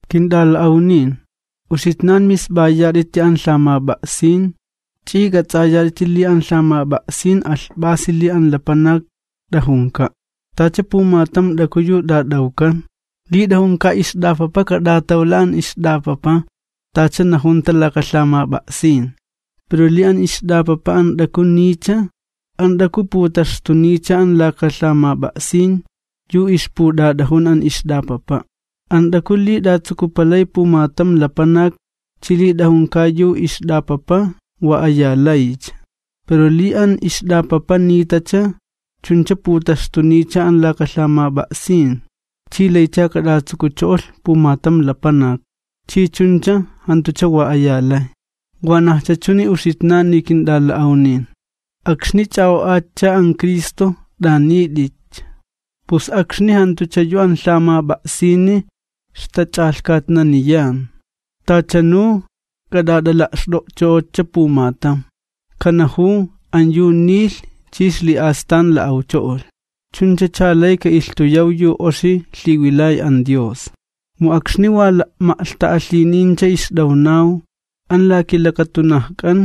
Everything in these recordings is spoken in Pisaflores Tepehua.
Kint'ala'awnin, uxitnan misp'ayat'iti an lhamap'a'sin, ch'i k'ats'ayat'iti li an lhamap'a'sin alhp'asi li an lapanak t'ajunka'. Tacha pumatam t'aku yu t'at'awkan, li t'ajunka ixt'apapa kat'atawla an ixt'apapa tacha najunta laka lhamap'a'sin, pero li an ixt'apapa an t'aku niycha, an t'aku putaxtuniycha an laka lhamap'a'sin, yu ixput'at'ajun an ixt'apapa'. An t'aku li t'atsukupalay pumatam lapanak chi li t'ajunka yu ixt'apapa, wa aya laycha, pero li an ixt'apapa nitacha, chuncha putaxtuniycha an laka lhamap'a'sin, chi laycha kat'atsukucho'olh pumatam lapanak chi chuncha jantucha wa aya lay. Wanajcha chuni uxitnani kint'ala'awnin, akxni ch'a'o'atcha an Cristo t'anit'itcha, pus akxni jantucha yu an lhamap'a'sini ixtach'alhkatnaniyan. Tachanu k'at'at'ala'xt'o'ch'o'otcha pumatam, kanajuw, an yu nilh chi ixli'astan la'awcho'olh. Chunchacha lay ka'ilhtuyaw yu oxi lhiwilay an Dios. Mu akxni wa la'ma'lhta'alhinincha ixt'awnaw, an la kilakatunajk'an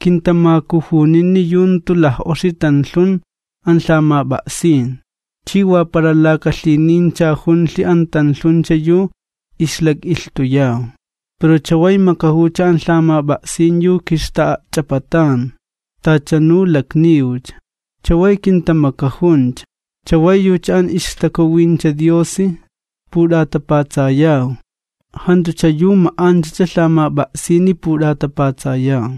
kintamakujunini yu jantu laj'oxi tanlhun an lhamap'a'sin, chi wa para laka lhinincha junlhi an tanlhuncha yu ixlak'ilhtuyaw. Pero chaway makajuwcha an lhamap'a'sin yu kixta'a'ch'apatan, tachanu lakniwcha. Chaway kintamakajuncha, chaway yucha an ixTakuwincha Diosi put'atapatsayaw. Jantucha yu ma'anchacha lhamap'a'sini put'atapatsayaw.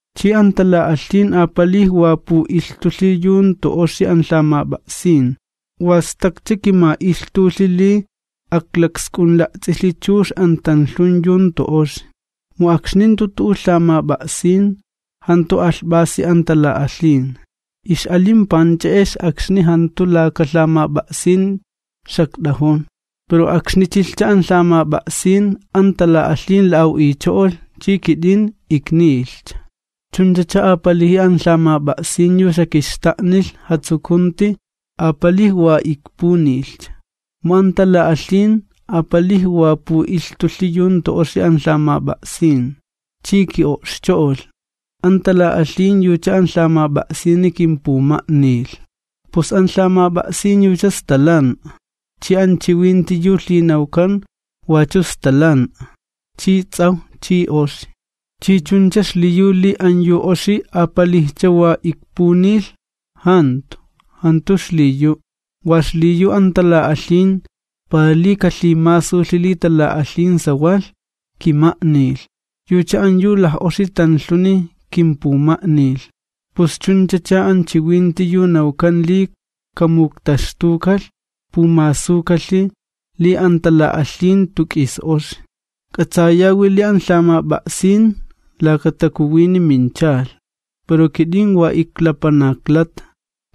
Chi an tala'alhin apalij wa pu'ilhtulhi yu jantu oxi an lhamap'a'sin, wa stakcha kima'ilhtulhi li aklaksk'unla'ts'ilhi chux an tanlhun yu jantu oxi, mu akxni jantu tu'u lhamap'a'sin, jantu alhp'asi an tala'alhin. Ix'alin panch'e'ex akxni jantu laka lhamap'a'sin xakt'ajun, pero akxni chilhcha an lhamap'a'sin an tala'alhin la'aw'icho'olh chi kit'in iknilhcha. Chunchacha apaliji an lhamap'a'sin yu xakixta'nilh jatsukunti, apalij wa ikpunilhcha. Mu an tala'alhin apalij wa pu'ilhtulhi yu jantu oxi an lhamap'a'sin, chi ki'o'xcho'olh, an tala'alhin yucha an lhamap'a'sini kimpuma'nilh. Pus an lhamap'a'sin yucha stalan'a chi an chiwinti yu lhinawkan wachu stalan'a chi ts'awj chi oxi. ¿Chi chuncha xliyu li an yu oxi apalijcha wa ikpunilh? ¡Jantu, jantu xliyu'! Wa xliyu an tala'alhin, para li kalhimasulhi li tala'alhin sawalh, kima'nilh, yucha an yu laj'oxi tanlhuni kimpuma'nilh. Pus chunchacha an chiwinti yu nawkan li kamuktaxtukalh pumasukalhi li an tala'alhin jantu k'is oxi. K'atsayawi li an lhamap'a'sin laka takuwini minchalh, pero kit'in wa iklapanaklata.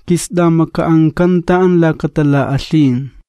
Kist'amaka'ankanta an laka tala'alhin.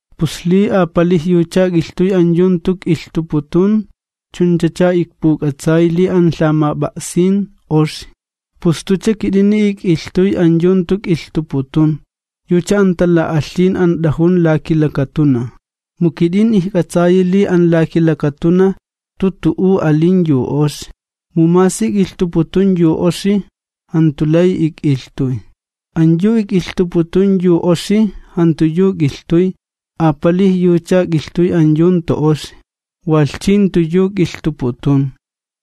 Pus li apalij yucha ik'ilhtuy an yu jantu k'ilhtuputun, chunchacha ikpuk'atsay li an lhamap'a'sin oxi. Pus jantucha kit'ini ik'ilhtuy an yu jantu k'ilhtuputun, yucha an tala'alhin an t'ajun la kilakatunaj. Mu kit'in ijk'atsayi li an la kilakatunaj jantu tu'u alin yu oxi, mu masi k'ilhtuputuni yu oxi, jantu lay ik'ilhtuy. An yu k'ilhtuputun yu oxi, jantu yu k'ilhtuy, apalij yucha k'ilhtuy an yu jantu oxi, walh chi jantu yu k'ilhtuputun.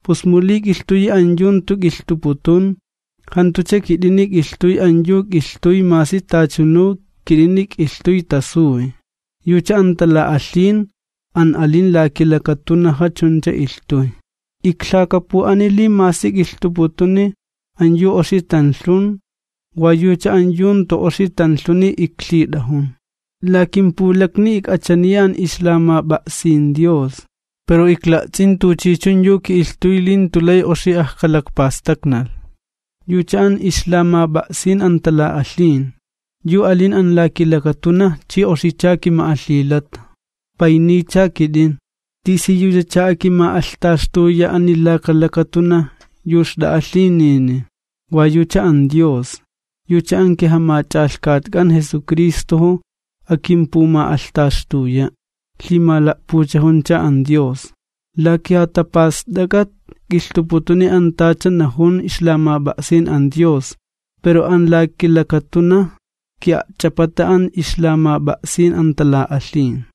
Pus mu li k'ilhtuyi an yu jantu ik'ilhtuputun, jantucha kit'ini k'ilhtuy an yu k'ilhtuy masi tachanu kit'ini k'ilhtuy tasuy, yucha an tala'alhin an alin an la kilakatunaja chuncha ilhtuy. Iklhakapu'ani li masi k'ilhtuputuni an yu oxi tanlhun, wa yucha an yu jantu oxi tanlhuni iklhit'ajun. La kimpulakni ik'achaniya an ixlamap'a'sin an Dios, pero ikla'ts'in tuchichun yu ki'ilhtuy li jantu lay oxi ajkalakpastaknalh, yucha an ixlamap'a'sin an tala'alhin, yu alin an la kilakatunaj chi oxicha kima'alhilata. ¡Payniycha kit'in! ¿Tisiyuchacha akima'alhtaxtuya ani laka lakatunaj yu xt'a'a lhinini? Wa yucha an Dios, yucha an kiJamach'alhkatk'an Jesucristojo akimpuma'alhtaxtuya', lhimala'puchajuncha an Dios. La kijatapast'ak'at k'ilhtuputuni an tacha najun ixlamap'a'sin an Dios, pero an la kilakatunaj ki'a'ch'apata an ixlamap'a'sin an tala'alhin.